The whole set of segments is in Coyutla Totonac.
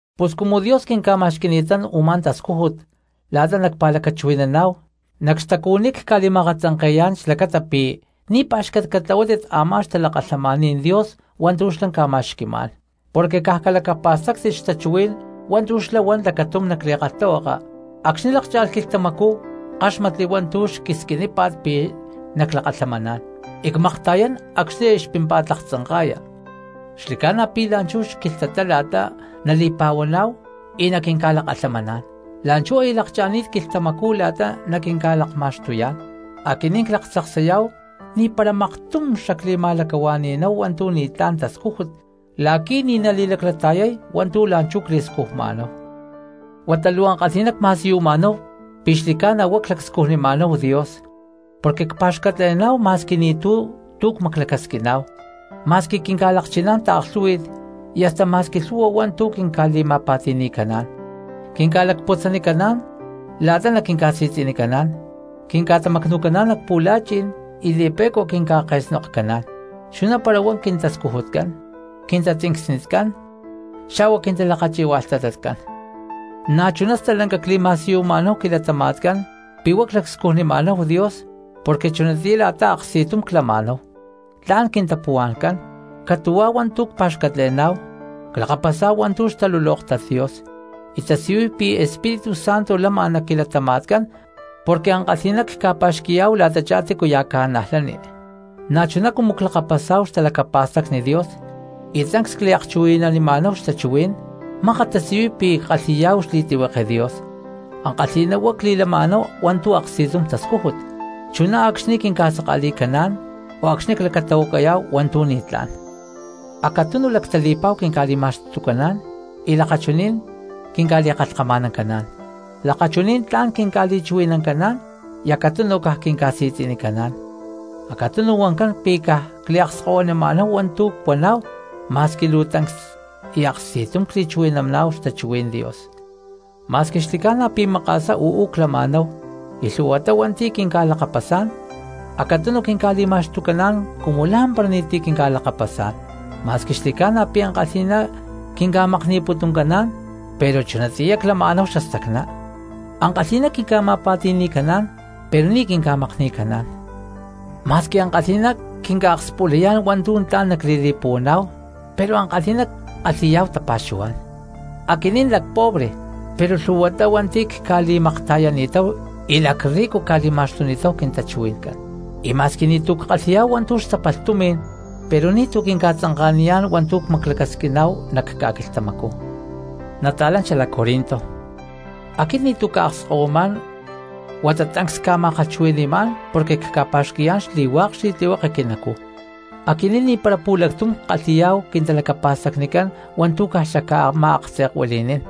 Pus cumu Dios quinca̠ma̠xqui̠ni̠tán u̠má tascújut la̠ta nacpa̠lacachuhui̠naná̠hu, nac xtacuhuiní cca̠li̠ma̠akatzanke̠yá̠n xlacata pi̠ ni̠ pá̠xcat catlahuátit a̠má xtalakalhamaní̠n Dios hua̠ntu̠ xlá ca̠ma̠xqui̠má̠n. Porque caj calacapa̠stáctit xtachuhuí̠n hua̠ntu̠ xlá huan lacatum nac li̠kalhtahuaka: Acxni̠ luu lákcha̠lh quilhtamacú ckáxmatli hua̠ntu̠ xquisquinípa̠t pi̠ naclakalhamaná̠n; y cmakta̠yán acxni̠ aya xpímpa̠t laktzanka̠ya. Xli̠ca̠na pi̠ la̠nchú xquilhtatá la̠ta nali̠pa̠huaná̠hu y naquinca̠lakalhamaná̠n. ¡La̠nchú aya lakcha̠ni̠t quilhtamacú la̠ta naquinca̠lakma̠xtuyá̠n! Aquinín claktzaksayá̠hu ni̠para maktum xacli̠ma̠lacahua̠ni̠náhu hua̠ntu̠ ni̠tlá̠n tascújut la̠qui̠ ni̠ nali̠laclata̠yay hua̠ntu̠ la̠nchú cli̠scujma̠náhu. Huata luu ankalhi̠ná cma̠siyuma̠náhu pi̠ xli̠ca̠na huá clacscujnima̠náhu Dios, porque cpa̠xcatle̠ná̠hu ma̠squi ni̠tu̠ tu̠ cmaclacasquima̠náhu, ma̠squi quinca̠lakchiná̠n taaklhú̠hui̠t, y hasta ma̠squi lhu̠hua hua̠ntu̠ quinca̠li̠ma̠pa̠ti̠ni̠caná̠n. Quinca̠lacputzanicaná̠n la̠ta naquinca̠si̠tzi̠nicaná̠n, quinca̠tamacnu̠caná̠n nac pu̠la̠chi̠n y li̠pe̠cua quinca̠ke̠snokcaná̠n, chuná para huá quintascujutcán, quintatzincsnicán, xa̠hua quintalakachi̠hualhtatacán. Na̠chuná stalanca cli̠ma̠siyuma̠náhu quilatama̠tcán pi̠ huá clacscujnima̠náhu Dios porque chunatiyá la̠ta aksti̠tum clama̠náhu, tla̠n quintapuhua̠ncán, catu̠huá hua̠ntu̠ cpa̠xcatle̠ná̠hu, clakapasá̠hu hua̠ntu̠ xtalulóktat Dios, y tasiyuy pi̠ Espíritu Santo lama nac quilatama̠tcán porque ankalhi̠ná cca̠pa̠xqui̠yá̠hu la̠tachá tícuya̠ cristiano. Na̠chuná cumu clakapasá̠hu xtalacapa̠stacni Dios y tancs cliakchuhui̠nanima̠náhu xtachuhuí̠n mákat tasiyuy pi̠ ckalhi̠yá̠hu xli̠tlihueke Dios. Ankalhi̠ná huá cli̠lama̠náhu hua̠ntu̠ aksti̠tum tascújut, chuná acxni̠ quinca̠saka̠li̠caná̠n o acxni̠ clacatahuacayá̠hu hua̠ntu̠ ni̠tlá̠n. Acatunu lactali̠pa̠hua quinca̠li̠ma̠xtucaná̠n y lakachuní̠n quinca̠li̠kalhkama̠nancaná̠n, lakachuní̠n tla̠n quinca̠li̠chuhui̠nancaná̠n y acatunu caj quinca̠si̠tzi̠nicaná̠n, acatunu huancán pi̠ caj cliakskahuinama̠náhu hua̠ntu̠ cuaná̠hu ma̠squi luu tancs y aksti̠tum cli̠chuhui̠naná̠hu xtachuhuí̠n Dios. Ma̠squi xli̠ca̠na pi̠ maka̠sá uú clama̠náhu y lhu̠huatá hua̠nti̠ quinca̠lakapasá̠n, acatunu quinca̠li̠ma̠xtucaná̠n cumu lá̠mpara ni̠ti̠ quinca̠lakapasá̠n. Ma̠squi xli̠ca̠na pi̠ ankalhi̠ná quinca̠makni̠putuncaná̠n, pero chunatiyá clama̠náhu xastacná; ankalhi̠ná quinca̠ma̠pa̠ti̠ni̠caná̠n pero ni̠ quinca̠makni̠caná̠n. Ma̠squi ankalhi̠ná quinca̠akspulayá̠n hua̠ntu̠ tla̠n nacli̠li̠puhuaná̠hu pero ankalhi̠ná ckalhi̠yá̠hu tapa̠xuhuá̠n; aquinín lacpobre pero lhu̠huatá hua̠nti̠ cca̠li̠makta̠yani̠táhu y lacrrico cca̠li̠ma̠xtuni̠ta̠hu quintachuhui̠ncán; y ma̠squi ni̠tu̠ ckalhi̠yá̠hu hua̠ntu̠ xtapalh tumi̠n pero ni̠tu̠cu quinca̠tzanka̠niyá̠n hua̠ntu̠ cmaclacasquiná̠hu nac quilatama̠tcán. Nata̠lán xalac Corinto, aquit ni̠tu̠ cca̠akskahuimá̠n huata tancs cca̠ma̠kalhchuhui̠ni̠má̠n porque cca̠pa̠xqui̠yá̠n xli̠hua̠k xli̠tlihueke quinacuj. Aquinín ni̠para pu̠lactum ckalhi̠yá̠hu quintalacapa̠stacnicán hua̠ntu̠ caj xacca̠ma̠aktze̠kuili̠nín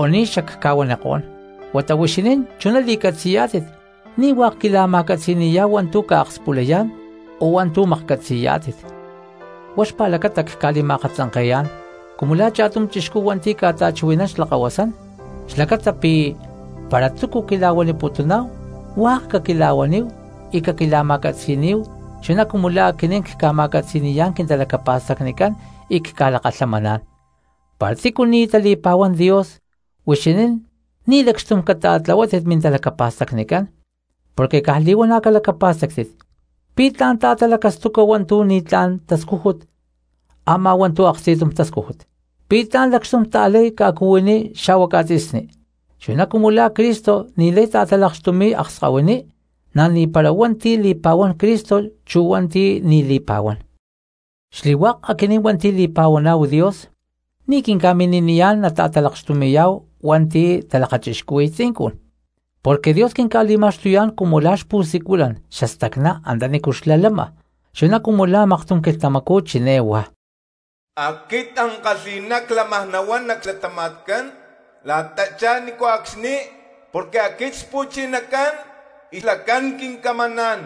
o ni̠ xacca̠huanikó̠n, huata huixinín chuná li̠catzi̠yá̠tit ni̠ hua̠k quila̠ma̠catzi̠ni̠yá̠hu hua̠ntu̠ ca̠akspulayá̠n o hua̠ntu̠ maklhcatzi̠yá̠tit. Huá xpa̠lacata cca̠li̠ma̠akatzanke̠yá̠n cumu la̠ cha̠tum chixcú hua̠nti̠ ca̠ta̠chuhui̠nán xlakahuasán, xlacata pi̠ para túcu quila̠huaniputuná̠hu hua̠k caquila̠huaníhu y caquila̠ma̠catzi̠níhu chuná cumu la̠ aquinín cca̠ma̠catzi̠ni̠yá̠n quintalacapa̠stacnicán y cca̠lakalhamaná̠n. Para tícu ni̠ tali̠pa̠huán Dios huixinín ni̠ lacxtum cata̠tlahuátit mintalacapa̠stacnicán, porque caj li̠huana̠ calacapa̠stáctit: ¿pi̠ tla̠n ta̠talacastuca hua̠ntu̠ ni̠tlá̠n tascújut a̠má hua̠ntu̠ aksti̠tum tascújut? ¿Pi̠ tla̠n lacxtum ta̠lay ca̠cuhuiní xa̠hua ca̠tzi̠sní? Chuná cumu la̠ Cristo ni̠lay ta̠talakxtumi̠y akskahuiní, na̠ ni̠para hua̠nti̠ li̠pa̠huán Cristo chu hua̠nti̠ ni̠ li̠pa̠huán. Xli̠hua̠k aquinín hua̠nti̠ li̠pa̠huaná̠hu Dios ni̠ quinca̠mini̠niyá̠n nata̠talakxtumi̠yá̠hu hua̠nti̠ talakachixcuhui̠y tzincun. Porque Dios quinca̠li̠ma̠xtuyá̠n cumu la̠ xpu̠siculán xastacná antanícu xlá lama, chuná cumu la̠ maktum quilhtamacú chiné huá: Aquit ankalhi̠ná clámaj nahuán nac xlatama̠tcán la̠tachá ni̠nco̠cxni, porque aquit Xpu̠chinacán y xlacán quincamaná̠n.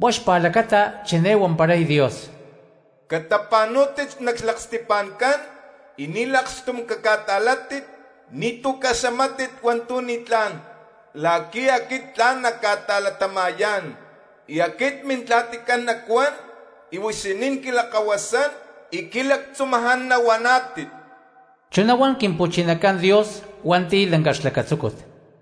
Huá xpa̠lacata chiné huamparay Dios: Catapa̠nú̠tit nac xlaksti̠pa̠ncán y ni̠ lakxtum caca̠ta̠látit; ni̠tu̠ caxamátit hua̠ntu̠ ni̠tlá̠n, la̠qui̠ aquit tla̠n nacca̠ta̠latama̠yá̠n, y aquit Mintla̠ticán nacuán y huixinín quilakahuasán y quilactzumaján nahuaná̠tit. Chuná huan Quimpu̠chinacán Dios hua̠nti̠ lanca xlacatzúcut.